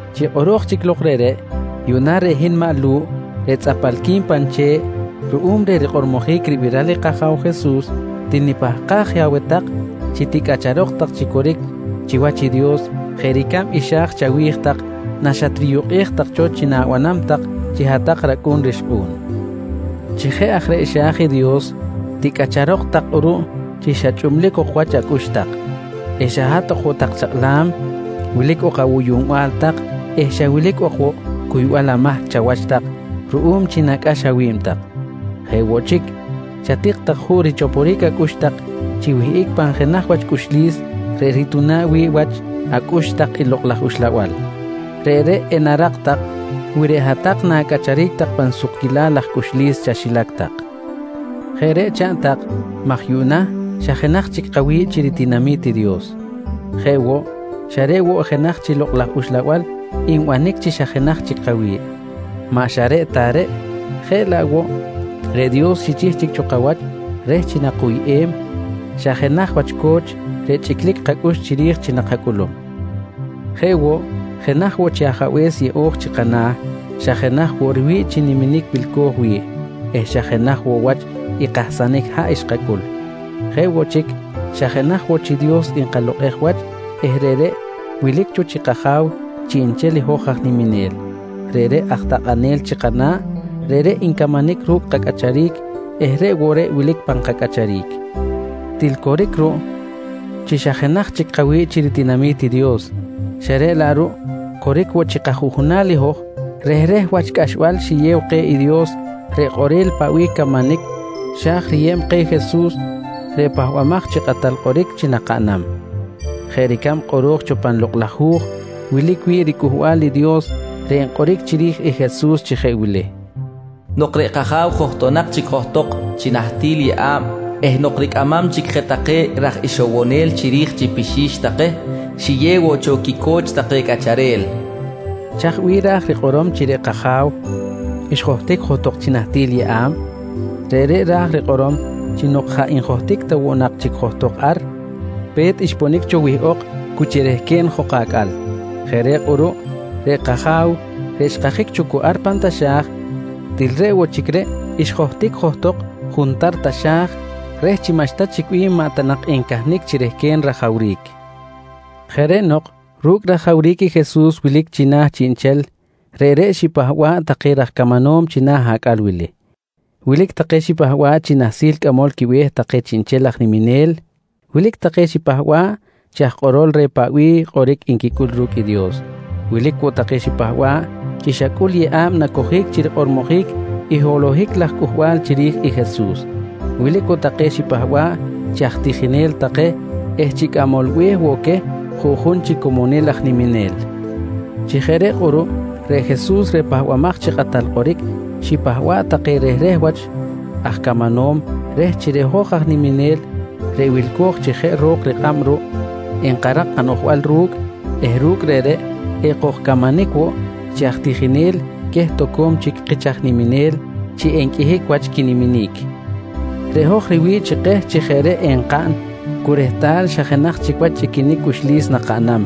Chi kꞌoro̱j chic lok reꞌreꞌ, yuꞌna reꞌ hin maꞌ Lu̱ꞌ reꞌ tzꞌapalqui̱n pan che̱ꞌ ruꞌum reh rikꞌormojic ribiral i kAja̱w Jesus til nipahkaj je aweh tak chi ticꞌacharok tak chi coric chiwach i Dios jeꞌ ricab i xa̱j chawi̱j tak naxatriyukꞌej tak cho chi na̱banam tak chi hat-tak racꞌu̱n rixkꞌu̱n. Chi jeꞌ aj reꞌ xa̱j i Dios, ticꞌacharok tak kꞌuruꞌ chi xa chꞌublic ok wach acꞌux tak, xa hat ok woꞌ tak chakꞌlam, wilic ok awuyuꞌnbal tak eh xa wilic ok woꞌ cuybal amahc chawach tak ruꞌum chi nacꞌax awi̱b tak. Jeꞌ woꞌ chic, chatik tak juꞌ richoporic acꞌux tak chi wihꞌic pan jenaj wach sukquil cꞌuxlis reꞌ rituna̱ꞌ wi̱ꞌ wach acꞌux tak i Lokꞌ laj Uxlabal. Reꞌreꞌ enarak tak wi reꞌ hat-tak na̱cꞌacharic tak pan sukquilal laj cꞌuxlis chaxilac tak. Jeꞌ reꞌ chaꞌn tak maj yuꞌna xa jenaj chic kawi̱ꞌ chi ritinami̱t i Dios. Jeꞌ woꞌ, xa reꞌ woꞌ i jenaj chi Lokꞌ laj Uxlabal nbanic chi xa jenaj chic kawi̱ꞌ. Maꞌ xa reꞌ ta reꞌ, jeꞌ laꞌ woꞌ reꞌ Dios xichih cho kawach reh chi nakuyꞌem xa jenaj wach co̱ch reꞌ chꞌiclic kacꞌux chiri̱j chi nakacꞌulum. Jeꞌ woꞌ, jenaj woꞌ chi Ajabe̱s yeꞌo̱j chi kana̱, xa jenaj woꞌ riwi̱ꞌ chi niminic wilco̱j wi̱ꞌ eh xa jenaj woꞌ wach i kahsanic haꞌ xkacꞌul. Jeꞌ woꞌ chic, xa jenaj woꞌ chi Dios nkalokꞌej wach eh reꞌreꞌ wilic cho chi kAja̱w chiꞌnchel i hoj aj niminel. Reꞌreꞌ aj takꞌanel chi kana̱, reꞌreꞌ ncamanic ru̱cꞌ kacꞌacharic eh reꞌ woꞌ reꞌ wilic pan kacꞌacharic. Til Coric ruꞌ chi xa jenaj chic kawi̱ꞌ chi ritinami̱t i Dios xa reꞌ laꞌ ruꞌ coric woꞌ chi kajuꞌjunal i hoj rehreh wach cꞌaxbal xiyew keh i Dios reꞌ kꞌorel paꞌ bih camanic xa̱j riyeb keh i Jesus reꞌ Pahbamaj chi Kꞌatal Kꞌoric chi nakaꞌnam jeꞌ ricab kꞌoro̱j cho pan Lokꞌ laj Hu̱j wilic wi̱ꞌ riCꞌuhbal i Dios reꞌ nkꞌoric chiri̱j i Jesus chi jeꞌ wili: “Nok reꞌ kAja̱w johtonak chic johtok chi nahtil yeꞌa̱b eh nok ricꞌamam chic je take raj ixowonel chiri̱j chi pixi̱x take, xiyew woꞌ cho quico̱ch take cꞌacharel, nqui rikꞌor. Chaj bih ra̱j rikꞌorom chi reꞌ kAja̱w xjohtic johtok chi nahtil yeꞌa̱b? Reꞌreꞌ ra̱j rikꞌorom chi nok jaꞌ njohtic ta woꞌ nak chic johtok ar, pe̱t xponic cho wihꞌok cu chi rehquen jok acꞌal. Jeꞌ reꞌ kꞌuruꞌ reꞌ kAja̱w reꞌ xkajic cho cu ar pan taxa̱j til reꞌ woꞌ chic reꞌ xjohtic johtok juntar taxa̱j reh chi maꞌxta chic bih maꞌ ta nak encahnic chi rehquen rajawric. Jeꞌ reꞌ nok ru̱cꞌ rajawric i Jesus wilic china̱ chiꞌnchel, reꞌreꞌ xipahba̱ꞌ take raj camanom china̱ acꞌal wili. Wilic take xipahba̱ꞌ chi nahsil cꞌamol quibe̱h take chiꞌnchel aj niminel, wilic take xipahba̱ꞌ chi aj kꞌorol reh paꞌ bih kꞌoric nquicꞌul ru̱cꞌ i Dios, wilic woꞌ take xipahba̱ꞌ chi xa cꞌul yeꞌa̱b nacojic chi rikꞌormojic i holohic laj cꞌuhbal chiri̱j i Jesus. Wilic woꞌ take xipahba̱ꞌ chi aj tijinel take eh chi aj cꞌamol be̱h woꞌ queh juꞌjun chi comonil aj niminel. Chi jeꞌ reꞌ kꞌuruꞌ reꞌ Jesus reꞌ Pahbamaj chi Kꞌatal Kꞌoric xipahba̱ꞌ take rehreh wach aj camanom reh chi reꞌ hoj aj niminel reꞌ wilco̱j chi jeꞌ ro̱k kꞌab ruꞌ, enkarak kanoꞌjbal ru̱cꞌ eh ru̱cꞌ reꞌreꞌ ekojcamanic woꞌ chi aj tijinel queh toco̱m chic kich aj niminel chi enqꞌuihic wach quiniminic. Reꞌ hoj riwi̱ꞌ chi keh chi jeꞌ reꞌ enkaꞌn cu rehtal xa jenaj chic wach chꞌiquinic cꞌuxlis nakaꞌnam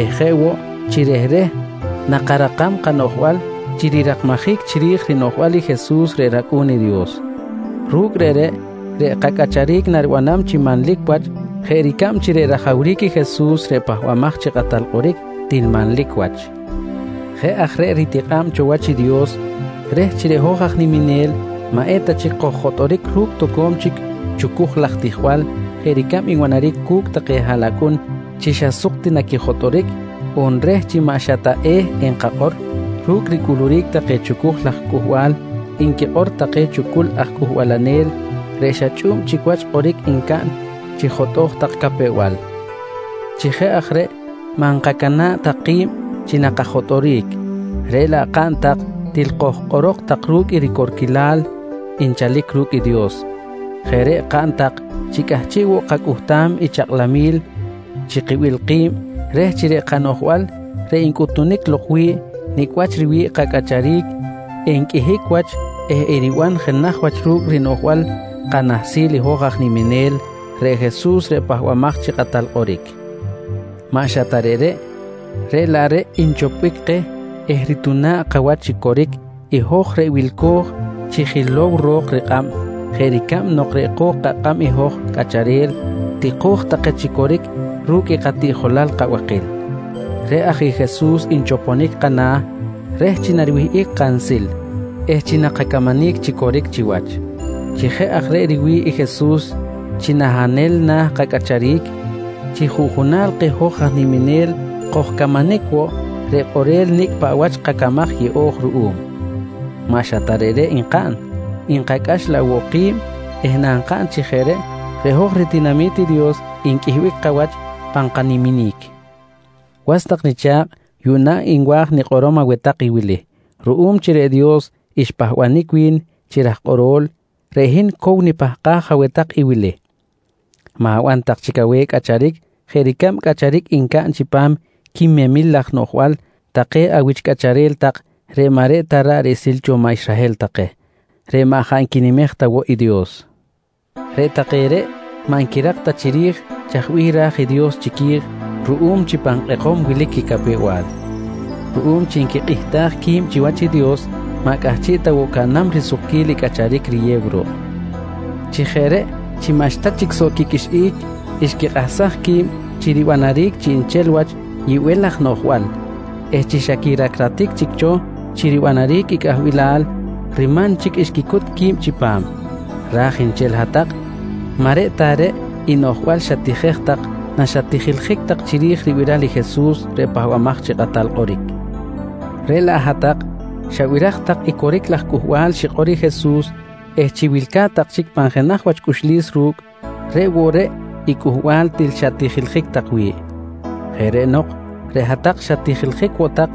eh jeꞌ woꞌ chi rehreh nakarakam kanoꞌjbal chi rirakmajic chiri̱j rinoꞌjbal i Jesus reꞌ rAcꞌu̱n i Dios. Ru̱cꞌ reꞌreꞌ, reꞌ kacꞌacharic naribanam chi manlic wach jeꞌ ricab chi reꞌ rajawric i Jesus reꞌ Pahbamaj chi Kꞌatal Kꞌoric til manlic wach. Jeꞌ aj reꞌ ritikꞌa̱b cho wach i Dios reh chi reꞌ hoj aj niminel maꞌeta chic koj-jotꞌoric ru̱cꞌ toco̱m chic chucuj laj tijbal jeꞌ ricab nbanaric cu̱cꞌ take haꞌlacꞌun chi xa suk ti naquijotꞌoric, on reh chi maꞌ xa ta e̱ enkakꞌor ru̱cꞌ ricꞌuluric take chucuj laj cꞌuhbal nquikꞌor take chucul aj cꞌuhbalanel reꞌ xa chꞌu̱b chic wach i kꞌoric ncaꞌn chi jotꞌoj tak capew-bal. Chi jeꞌ aj reꞌ maꞌ nkacana̱ꞌ tak ki̱b chi nakajotꞌoric, reꞌ laꞌ kaꞌn tak til kojkꞌorok tak ru̱cꞌ i ricorquilal nchalic ru̱cꞌ i Dios. Jeꞌ reꞌ kaꞌn tak chi cꞌahchiꞌ woꞌ kacꞌuhtam i chakꞌlamil chi kibil ki̱b reh chi reꞌ kanoꞌjbal reꞌ ncꞌutunic lok wi̱ꞌ nicꞌ wach riwi̱ꞌ kacꞌacharic, enqꞌuihic wach eh eriban jenaj wach ru̱cꞌ rinoꞌjbal kanahsil i hoj aj niminel reꞌ Jesus reꞌ Pahbamaj chi Kꞌatal Kꞌoric. Maꞌ xa ta reꞌreꞌ, reꞌ laꞌ reꞌ nchopbic keh eh rituna̱ꞌ kawach chi coric i hoj reꞌ wilco̱j chi jilow ro̱k rikꞌab jeꞌ ricab nok reꞌ ko̱k kakꞌab i hoj cꞌacharel tiko̱j take chi coric ru̱cꞌ i katiꞌjolal kabakil. Reꞌ aj i Jesus nchoponic kana̱ reh chi nariwihꞌic kansil eh chi nakacamanic chi coric chiwach. Chi jeꞌ aj reꞌ riwi̱ꞌ i Jesus chi nahanel na̱ kacꞌacharic, chi juꞌjunal keh hoj aj niminel kojcamanic woꞌ reꞌ kꞌorel nicꞌ paꞌ wach kacamaj yeꞌo̱j ruꞌum. Maꞌ xa ta reꞌreꞌ nkaꞌn, nkacꞌax laꞌ woꞌ ki̱b eh nankaꞌn chi jeꞌ reꞌ, reꞌ hoj ritinami̱t i Dios nqꞌuihbic wach pan kaniminic. Was tak nicha̱kꞌ yuꞌna nwa̱j nikꞌorom aweh tak i wili: Ruꞌum chi reꞌ Dios xpahbanic wi̱n chi raj kꞌoro̱l, reꞌ hin cow nipahkaj aweh tak i wili: Ma̱ban tak chic aweh cꞌacharic jeꞌ ricab cꞌacharic ncaꞌn chipam quimemil laj noꞌjbal take awich cꞌacharel tak reꞌ maꞌ reꞌ ta ra̱ꞌ riꞌsil cho maꞌ Israhel take reꞌ jaꞌ maꞌ nquinimej ta woꞌ i Dios. Reꞌ take reꞌ maꞌ nquirak ta chiri̱j chaj bih ra̱j Dios chiqui̱j ruꞌum chi pan kꞌekom wilic quicapew-bal. Ruꞌum chi nquikꞌihtaj qui̱b chiwach i Dios, maꞌ cꞌahchiꞌ ta woꞌ caꞌnam risukquil i cꞌacharic riyew ruꞌ. Chi jeꞌ reꞌ chi maꞌxta chic soꞌ quiqꞌuixꞌic, xquikꞌahsaj qui̱b chi ribanaric chiꞌnchel wach yibel laj noꞌjbal eh chi xa quiracratic chic cho chi ribanaric i cꞌahbilal, riman chic xquicut qui̱b chipam. Raj nchel i hat-tak maꞌ reꞌ ta reꞌ i noꞌjbal xatijej tak naxatijiljic tak chiri̱j ribiral i Jesus reꞌ Pahbamaj chi Kꞌatal Kꞌoric, reꞌ laꞌ hat-tak xabiraj tak i coric laj cꞌuhbal xikꞌor i Jesus eh chi wilca̱t tak chic pan jenaj wach cꞌuxlis ru̱cꞌ, reꞌ woꞌ reꞌ i cꞌuhbal til xat-tijiljic tak wi̱ꞌ. Jeꞌ reꞌ nok reꞌ hat-tak xat-tijiljic woꞌ tak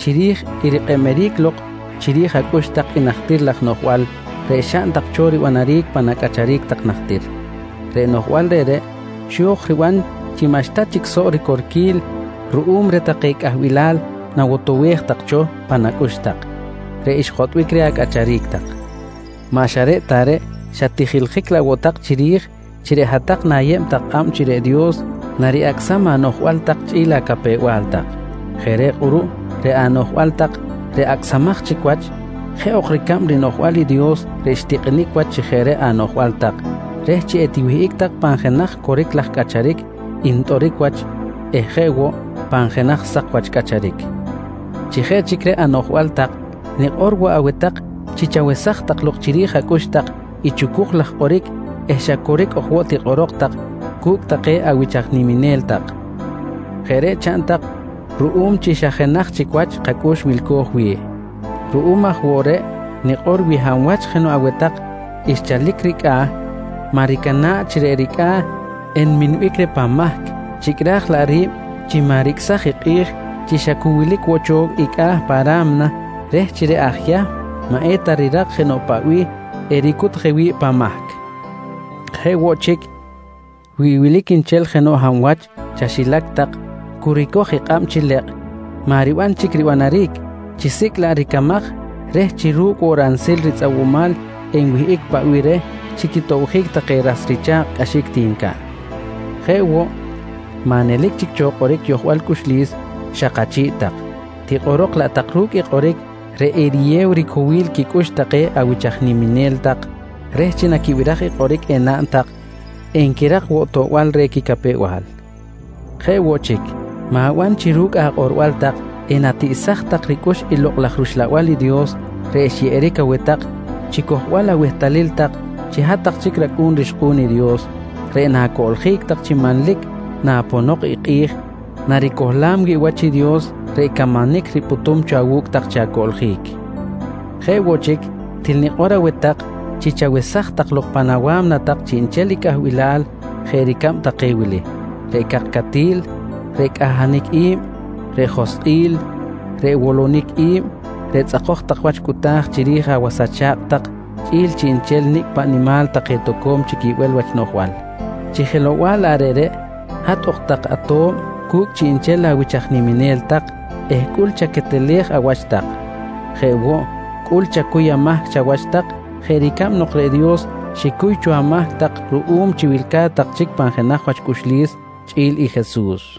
chiri̱j i rikꞌeb-eric lok chiri̱j acꞌux tak i najtir laj noꞌjbal reꞌ xaꞌn tak cho ribanaric pan acꞌacharic tak najtir. Reꞌ noꞌjbal reꞌreꞌ xo̱j riban chi xa maꞌxta chic soꞌ ricorquil ruꞌum reh take cꞌahbilal nawotowej cho pan acꞌux tak reꞌ xjotꞌbic reh acꞌacharic tak. Maꞌ xa reꞌ ta reꞌ, xat-tijiljic laꞌ woꞌ tak chiri̱j chi reꞌ hat-tak na̱yeb tak kꞌab chi reꞌ Dios nari-acꞌsam anoꞌjbal tak chꞌi̱l acapew-bal tak. Jeꞌ reꞌ kꞌuruꞌ reꞌ anoꞌjbal tak reꞌ acꞌsamaj chic wach, jeꞌ ok ricab rinoꞌjbal i Dios reꞌ xtikꞌinic wach chi jeꞌ reꞌ anoꞌjbal tak reh chi etiwihꞌic tak pan jenaj coric laj cꞌacharic ntꞌoric wach eh jeꞌ woꞌ pan jenaj sak wach cꞌacharic. Chi jeꞌ chic reꞌ anoꞌjbal tak, nikꞌor woꞌ aweh tak chi chawesaj tak lok chiri̱j acꞌux tak i chucuj laj kꞌoric eh xa coric ok woꞌ tikꞌorok tak cu̱cꞌ take awich aj niminel tak. Jeꞌ reꞌ chaꞌn tak ruꞌum chi xa jenaj chic wach kacꞌux wilco̱j wi̱ꞌ. Ruꞌum aj woꞌ reꞌ nikꞌor wi hab wach jenoꞌ aweh tak xchalic ricꞌa̱, maꞌ ricana̱ꞌ chi reꞌ ricꞌa̱ enminbic reh pan mahc, chicꞌraj laꞌ ri̱b chi maꞌ ricꞌsaj i kꞌi̱j chi xa cu wilic woꞌ cho i cꞌa̱ pa ra̱mna, reh chi reꞌ aj Yahm maꞌ eta rirak jenoꞌ paꞌ bih ericut je wi̱ꞌ pan mahc Jeꞌ woꞌ chic, wi wilic nchel jenoꞌ hab wach chaxilac tak cu ricoj i kꞌab chi lekꞌ maꞌ riban chic ribanjic, chisicꞌ laꞌ ricamaj reh chi ru̱cꞌ woꞌ ransil ritzꞌawumal enwihꞌic paꞌ bih reh chi quitobjic take ras richa̱kꞌ cꞌaxic ti ncaꞌn. Jeꞌ woꞌ, maꞌ nelic chic cho kꞌoric yojbal cꞌuxlis xak achi̱ꞌ tak, tikꞌorok laꞌ tak ru̱cꞌ i kꞌoric reꞌ eriyew ricowil quicꞌux take awich aj niminel tak reh chi naquibiraj i kꞌoric enaꞌn tak, enquirak woꞌ toꞌbal reh quicapew-bal. Jeꞌ woꞌ chic, ma̱ban chi ru̱cꞌ akꞌorbal tak enatiꞌsaj tak ricꞌux i Lokꞌ laj rUxlabal i Dios reꞌ xyeꞌeric aweh tak chi cojbal awehtalil tak chi hat-tak chic racꞌu̱n rixkꞌu̱n i Dios reꞌ na̱coꞌljic tak chi manlic naponok i kꞌi̱j naricohlam wi̱ꞌ wach i Dios reꞌ camanic ripꞌutum cho awu̱cꞌ tak chi acoꞌljic. Jeꞌ woꞌ chic, til nikꞌor aweh tak chi chawesaj tak lok pan awa̱mna tak chiꞌnchel i cꞌahbilal jeꞌ ricab take wili: Reꞌ cakcatil, reꞌ cꞌahanic i̱b, reꞌ joskꞌil, reꞌ wolonic i̱b, reꞌ tzꞌakoj tak wach cꞌuta̱j chiri̱j awas acha̱kꞌ tak chꞌi̱l chiꞌnchel nicꞌ paꞌ nimal take toco̱m chic yibel wach noꞌjbal. Chi jelow-bal laꞌ reꞌreꞌ, hat ok tak ato̱b cu̱cꞌ chiꞌnchel awich aj niminel tak eh cꞌul chaquetelej awach tak. Jeꞌ woꞌ, cꞌul chacuy amahc chawach tak jeꞌ ricab nok reꞌ Dios xicuy cho amahc tak ruꞌum chi wilca̱t tak chic pan jenaj wach cꞌuxlis chꞌi̱l i Jesus.